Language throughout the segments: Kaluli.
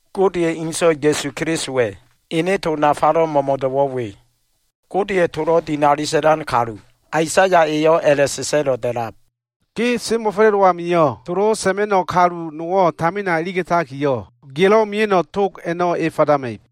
Godeya꞉ ene So꞉wa, Ya꞉su Kelisowa꞉ ene to nafalo꞉ mo꞉mo꞉do꞉wo꞉ we. Godeya꞉ tolo꞉ dinali sa꞉lan kalu, Aisaya eyo꞉ a꞉la꞉sa꞉sa꞉lo꞉ da꞉lab, “ Ge semo꞉fa꞉la꞉dowo꞉ amio꞉, tolo꞉ sa꞉ma꞉no꞉ kalu nowo꞉ tamina iliga꞉takiyo꞉, gelo꞉ mia꞉no꞉ tog a꞉no꞉ e fadama꞉ib.”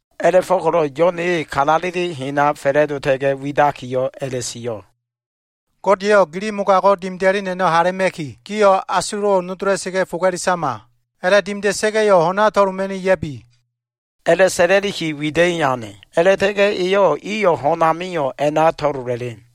A꞉la꞉fo꞉ko꞉lo꞉ Yo꞉n e kalaleli hen a꞉na fa꞉la꞉dota꞉ga꞉ widakiyo꞉ a꞉la꞉sio꞉, “Gode eyo꞉ gili mogago꞉ dimida꞉len a꞉no꞉ hala꞉ma꞉ki, gio꞉ asulo꞉wo꞉ nodola꞉sa꞉ga꞉ foga꞉le sama. A꞉la꞉dimida꞉sa꞉ga꞉yo꞉ ho꞉na to꞉loma꞉ni ya꞉bi” a꞉la꞉sa꞉la꞉liki wida꞉i ane. A꞉la꞉ta꞉ga꞉ eyo꞉ iyo꞉ ho꞉n amio꞉ a꞉na to꞉lola꞉len.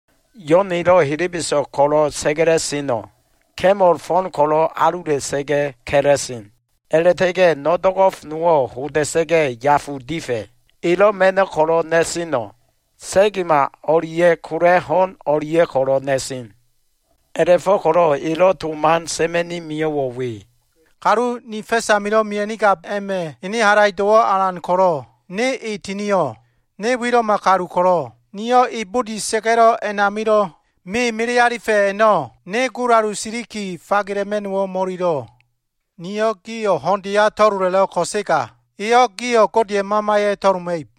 Yo꞉n elo꞉ helebeso꞉g ko꞉lo꞉ sa꞉ga꞉la꞉seno꞉ ka꞉mol fo꞉n ko꞉lo꞉ alula꞉sa꞉ga꞉ ka꞉la꞉sen. A꞉la꞉ta꞉ga꞉ no꞉ do꞉go꞉f nowo꞉ hoda꞉sa꞉ga꞉ yafu difa꞉. Elo꞉ ma꞉no꞉ ko꞉lo꞉ na꞉seno꞉ sa꞉gema o꞉lia꞉ kola꞉ ho꞉n o꞉lia꞉ ko꞉lo꞉ na꞉sen. A꞉la꞉fo꞉ko꞉lo꞉ elo꞉ to man sa꞉ma꞉ni mio꞉wo꞉ we. “Kalu ni fa꞉s amilo꞉ mia꞉nigab a꞉ma꞉ ene halaido꞉wo꞉ alan ko꞉lo꞉, ne e tinio꞉. Ne wilo꞉ma kalu ko꞉lo꞉, niyo꞉ e budi sa꞉ga꞉lo꞉ a꞉namilo꞉ me melealifa꞉ a꞉no꞉ ne gulalu siliki fagela꞉ma꞉no꞉wo꞉ mo꞉ililo꞉. Niyo꞉ gio꞉ ho꞉ndeya to꞉lola꞉lo꞉l ko꞉sega, eyo꞉ gio꞉ Godeya꞉ Mamaya꞉ to꞉loma꞉ib.”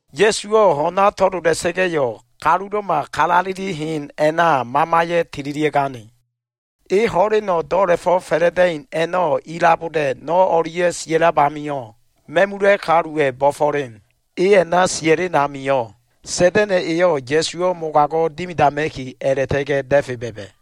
Ya꞉suwo꞉ ho꞉na to꞉lola꞉sa꞉ga꞉yo꞉, kalulo꞉ma kalaleli hen a꞉na, Mamaya꞉ tililia꞉gane. E ho꞉leno꞉ do꞉la꞉fo꞉ fa꞉la꞉da꞉in a꞉no꞉ ilaboda꞉ no꞉ o꞉lia꞉ sia꞉lab amio꞉, ma꞉mula꞉ kaluwa꞉ bo꞉fo꞉len. E a꞉na sia꞉len amio꞉, Sa꞉da꞉na꞉ eyo꞉ Ya꞉suwo꞉ mogago꞉ dimidama꞉ki, a꞉la꞉ta꞉ga꞉ da꞉fe ba꞉ba꞉.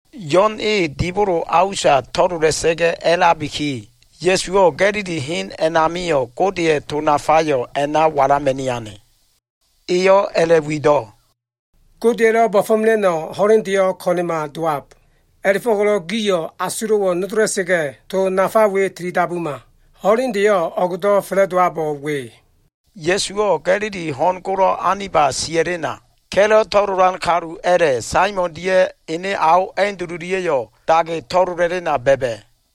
Yo꞉n e dibolo a usa to꞉lola꞉sa꞉ga꞉ a꞉labiki, Ya꞉suwo꞉ Ga꞉lili hen a꞉namio꞉ Godeya꞉ to nafayo꞉ a꞉na walama꞉ni ane. Eyo꞉ a꞉la꞉wido꞉, “Godeya꞉lo꞉ bo꞉fo꞉mela꞉no꞉ ho꞉lendeyo꞉ ko꞉na꞉ma dowab. A꞉la꞉fo꞉ko꞉lo꞉ gio꞉ o꞉go꞉ asulo꞉wo꞉ nodola꞉sa꞉ga꞉, to nafa we tilidabuma. Ho꞉lendeyo꞉ o꞉gdo꞉ fa꞉la꞉dowabo꞉ we.” Ya꞉suwo꞉ Ga꞉lili ho꞉n golo꞉ aniba sia꞉lena, ka꞉lo꞉ to꞉lolan kalu a꞉la꞉, Saimon dia꞉ ene ao Andululia꞉yo꞉ dage to꞉lola꞉lena ba꞉ba꞉.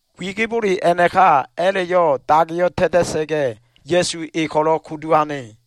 Wigibole a꞉naka a꞉la꞉yo꞉ dageyo꞉ ta꞉ta꞉sa꞉ga꞉, Ya꞉su e ko꞉lo꞉ kudu ane.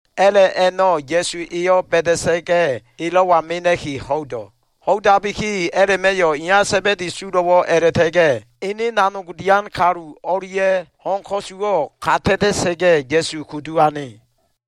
A꞉la꞉ a꞉no꞉ Ya꞉su eyo꞉ ba꞉da꞉sa꞉ga꞉, elo꞉wa mena꞉ki ho꞉ido꞉. Ho꞉idabiki a꞉la꞉ma꞉yo꞉ iya Sa꞉ba꞉di sulo꞉wo꞉ a꞉la꞉ta꞉ga꞉ ene nanog dian kalu o꞉lia꞉yo꞉ ho꞉n ko꞉su ka ta꞉ta꞉ga꞉, Ya꞉su kudu ane.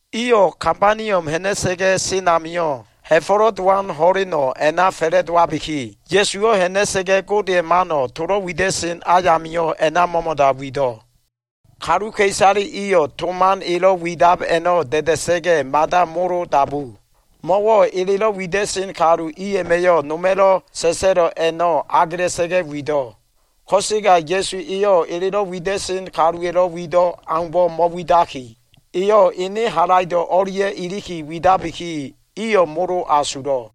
Iyo꞉ Kabaniom ha꞉na꞉sa꞉ga꞉ sen amio꞉, Ha꞉fo꞉lo꞉ Dowan ho꞉leno꞉ a꞉na fa꞉la꞉dowabiki, Ya꞉suwo꞉ ha꞉na꞉sa꞉ga꞉ Godeya꞉ mano꞉ tolo꞉ wida꞉sen ayamio꞉ a꞉na mo꞉mo꞉da wido꞉. Kaluka꞉isale iyo꞉ to man elo꞉ widab a꞉no꞉ da꞉da꞉sa꞉ga꞉ mada molo dabu. Mo꞉wo꞉ elelo꞉ wida꞉sen kalu i a꞉ma꞉yo꞉ noma꞉lo꞉ sa꞉sa꞉lo꞉ a꞉no꞉ agela꞉sa꞉ga꞉ wido꞉. Ko꞉sega Ya꞉su eyo꞉ elelo꞉ wida꞉sen kaluwa꞉lo꞉ wido꞉ aumbo꞉ mo꞉widaki, eyo꞉ ene halaido꞉ o꞉lia꞉ iliki widabiki, iyo꞉ molo asulo꞉.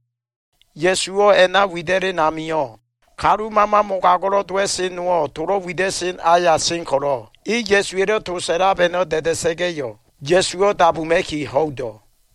Ya꞉suwo꞉ a꞉na wida꞉len amio꞉, kalu mama mogago꞉lo꞉ dowa꞉sen nowo꞉ tolo꞉ wida꞉sen aya sen ko꞉lo꞉, e Ya꞉su elo꞉ to sa꞉lab a꞉no꞉ da꞉da꞉sa꞉ga꞉yo꞉, Ya꞉suwo꞉ dabuma꞉ki ho꞉ido꞉.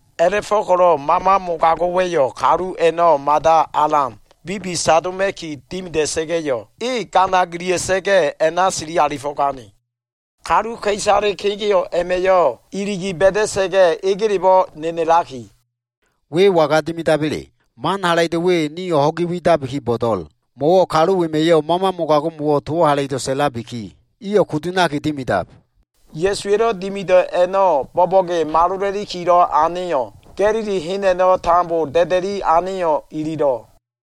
A꞉la꞉fo꞉ko꞉lo꞉ mama mogago꞉wa꞉yo꞉ kalu a꞉no꞉ mada alan bibisadoma꞉ki dimida꞉sa꞉ga꞉yo꞉, e gana gilia꞉sa꞉sa꞉ga꞉ a꞉na sili alifo꞉gane. Kaluka꞉isale kegeo꞉ a꞉ma꞉yo꞉ iligi ba꞉da꞉sa꞉ga꞉ egelebo꞉ nenelaki, “We waga dimidaba꞉le? Man halaido꞉ we, nio꞉ ho꞉gi widabiki bo꞉do꞉l. Mo꞉wo꞉ kalu wema꞉yo꞉ mama mogago꞉mo꞉wo꞉ towo꞉ halaido꞉ sa꞉labiki, iyo꞉ kudu ha꞉naki dimidab.” Ya꞉suwa꞉lo꞉ dimido꞉ a꞉no꞉ bo꞉bo꞉ge malola꞉likilo꞉ aneyo꞉, Ga꞉lili hen a꞉no꞉ tambo da꞉da꞉i aneyo꞉ ililo꞉.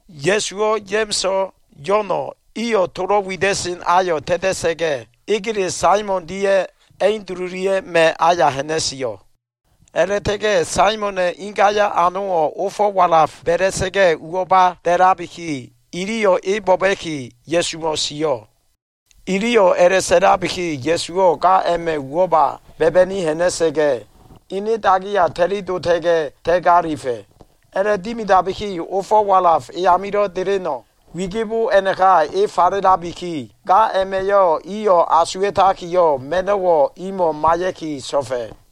Ya꞉suwo꞉, Ya꞉ma꞉so꞉, Yo꞉no꞉ iyo꞉ tolo꞉ wida꞉sen ayo꞉ ta꞉ta꞉sa꞉ga꞉, egele Saimon dia꞉ Andululia꞉ma꞉ aya ha꞉na꞉sio꞉. A꞉la꞉ta꞉ga꞉ Saimona꞉ ingaya꞉ anowo꞉ ofo꞉ walaf ba꞉la꞉sa꞉ga꞉ uwo꞉ba da꞉labiki, iliyo꞉ e bo꞉ba꞉ki Ya꞉sumo꞉ sio꞉. Iliyo꞉ a꞉la꞉sa꞉labiki, Ya꞉suwo꞉ ga a꞉ma꞉ uwo꞉ba ba꞉ba꞉ni ha꞉na꞉sa꞉ga꞉, ene dagiya ta꞉li dota꞉ga꞉ ta꞉galifa꞉. A꞉la꞉dimidabiki ofo꞉ walaf e amilo꞉ deleno꞉ wigibo a꞉naka e falelabiki, ga a꞉ma꞉yo꞉ iyo꞉ asuwa꞉takiyo꞉, ma꞉no꞉wo꞉ imo꞉ maiya꞉ki so꞉fa꞉.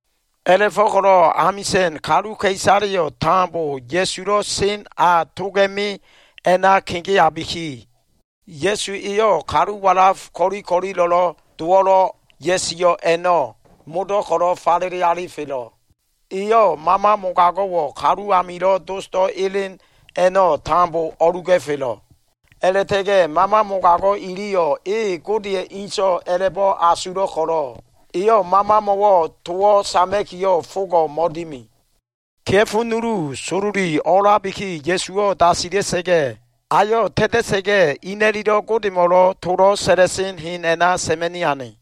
A꞉la꞉fo꞉ko꞉lo꞉ amisa꞉n kaluka꞉isaleyo꞉ tambo Ya꞉sulo꞉ sen a toga꞉me a꞉na kegeabiki, Ya꞉su eyo꞉ kalu walaf ko꞉li ko꞉lilo꞉lo꞉ dowo꞉lo꞉ ya꞉sio꞉ a꞉no꞉ modo꞉ ko꞉lo꞉ falele alifelo꞉. Eyo꞉ mama mogago꞉wo꞉ kalu amilo꞉ dosdo꞉ elen a꞉no꞉ tambo o꞉luga꞉felo꞉. A꞉la꞉ta꞉ga꞉ mama mogago꞉ iliyo꞉ e Gode Inso꞉ a꞉la꞉bo꞉ asulo꞉ ko꞉lo꞉, Eyo꞉ mamamo꞉wo꞉ towo꞉ sama꞉kiyo꞉ fogo꞉ mo꞉dimi. Kea꞉fo nulu sololi olabiki, Ya꞉suwo꞉ dasila꞉sa꞉ga꞉, ayo꞉ ta꞉ta꞉sa꞉ga꞉, ina꞉lilo꞉ Godemo꞉lo꞉ tolo꞉ sa꞉la꞉sen hen a꞉na sa꞉ma꞉ni ane.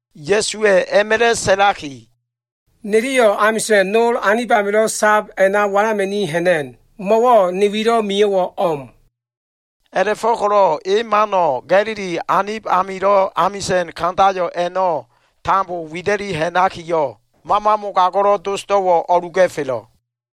Ya꞉suwa꞉ a꞉ma꞉la꞉ sa꞉laki, “Niliyo꞉ amisa꞉n nol anib amilo꞉ sab a꞉na walama꞉ni ha꞉na꞉n. Mo꞉wo꞉ ne wilo꞉ mio꞉wo꞉ o꞉m.” A꞉la꞉fo꞉ko꞉lo꞉ e mano꞉ Ga꞉lili anib amilo꞉ amisa꞉n kandayo꞉ a꞉no꞉ tambo wida꞉liki ha꞉nakiyo꞉, mama mogago꞉lo꞉ dosdo꞉wo꞉ o꞉luga꞉felo꞉.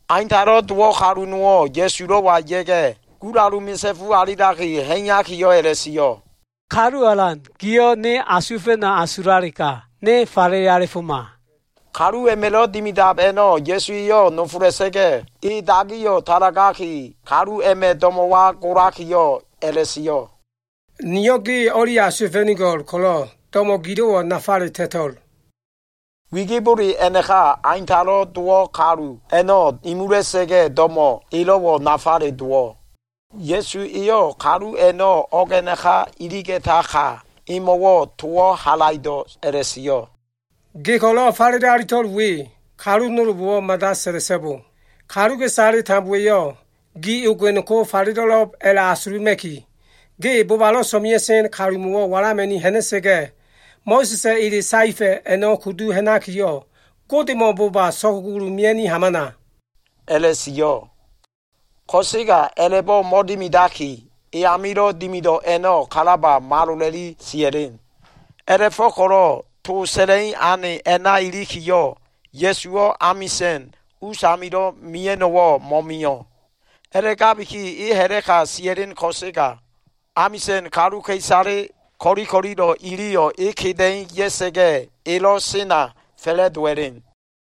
Aintalo꞉ dowo꞉ kalu nowo꞉ Ya꞉sulo꞉wa ya꞉ga꞉, gulalu misa꞉fu alilaki ha꞉iyakiyo꞉ a꞉la꞉sio꞉, “Kalu Alan giyo꞉ ne asuwa꞉fa꞉no꞉ asulalega, ne falele alifoma.” Kalu a꞉ma꞉lo꞉ dimidab a꞉no꞉ Ya꞉su eyo꞉ nofola꞉sa꞉ga꞉, e dagiyo꞉ talagaki, kalu a꞉ma꞉ do꞉mo꞉wa golakiyo꞉ a꞉la꞉sio꞉, “Niyo꞉ ge o꞉li asuwa꞉fa꞉nigo꞉l ko꞉lo꞉, do꞉mo꞉ gilo꞉wo꞉ nafale ta꞉to꞉l.” Wigibole a꞉naka, aintalo꞉ dowo꞉ kalu a꞉no꞉ imula꞉sa꞉ga꞉, do꞉mo꞉ elo꞉wo꞉ nafale dowo꞉. Ya꞉su eyo꞉ kalu a꞉no꞉ o꞉g a꞉naka iliga꞉taka, emo꞉wo꞉ towo꞉ halaido꞉ a꞉la꞉sio꞉, “Ge ko꞉lo꞉ falele alito꞉l we kalu nolbo꞉wo꞉ mada sa꞉la꞉so꞉bo. Kaluka꞉isale tambowa꞉yo꞉ gi ogen ko falelo꞉lo꞉b a꞉la꞉asuluma꞉ki, ge bobalo꞉ so꞉mea꞉sen kalumo꞉wo꞉ walama꞉ni ha꞉na꞉sa꞉ga꞉, Mo꞉sa꞉sa꞉ ele saefa꞉ a꞉no꞉ kudu ha꞉nakiyo꞉, Godemo꞉ boba so꞉kugulu mea꞉niki hamana” a꞉la꞉sio꞉. Ko꞉sega a꞉la꞉bo꞉ mo꞉dimidaki, e amilo꞉ dimido꞉ a꞉no꞉ kalaba malola꞉li sia꞉len. A꞉la꞉fo꞉ko꞉lo꞉ to sa꞉la꞉i ane a꞉na ilikiyo꞉, Ya꞉suwo꞉ amisa꞉n usamilo꞉ mia꞉no꞉wo꞉ mo꞉mio꞉. A꞉la꞉gabiki e ha꞉la꞉ka sia꞉len ko꞉sega, amisa꞉n kaluka꞉isale ko꞉li ko꞉lilo꞉ iliyo꞉ e keda꞉i ya꞉sa꞉ga꞉ elo꞉ sena fa꞉la꞉dowa꞉len.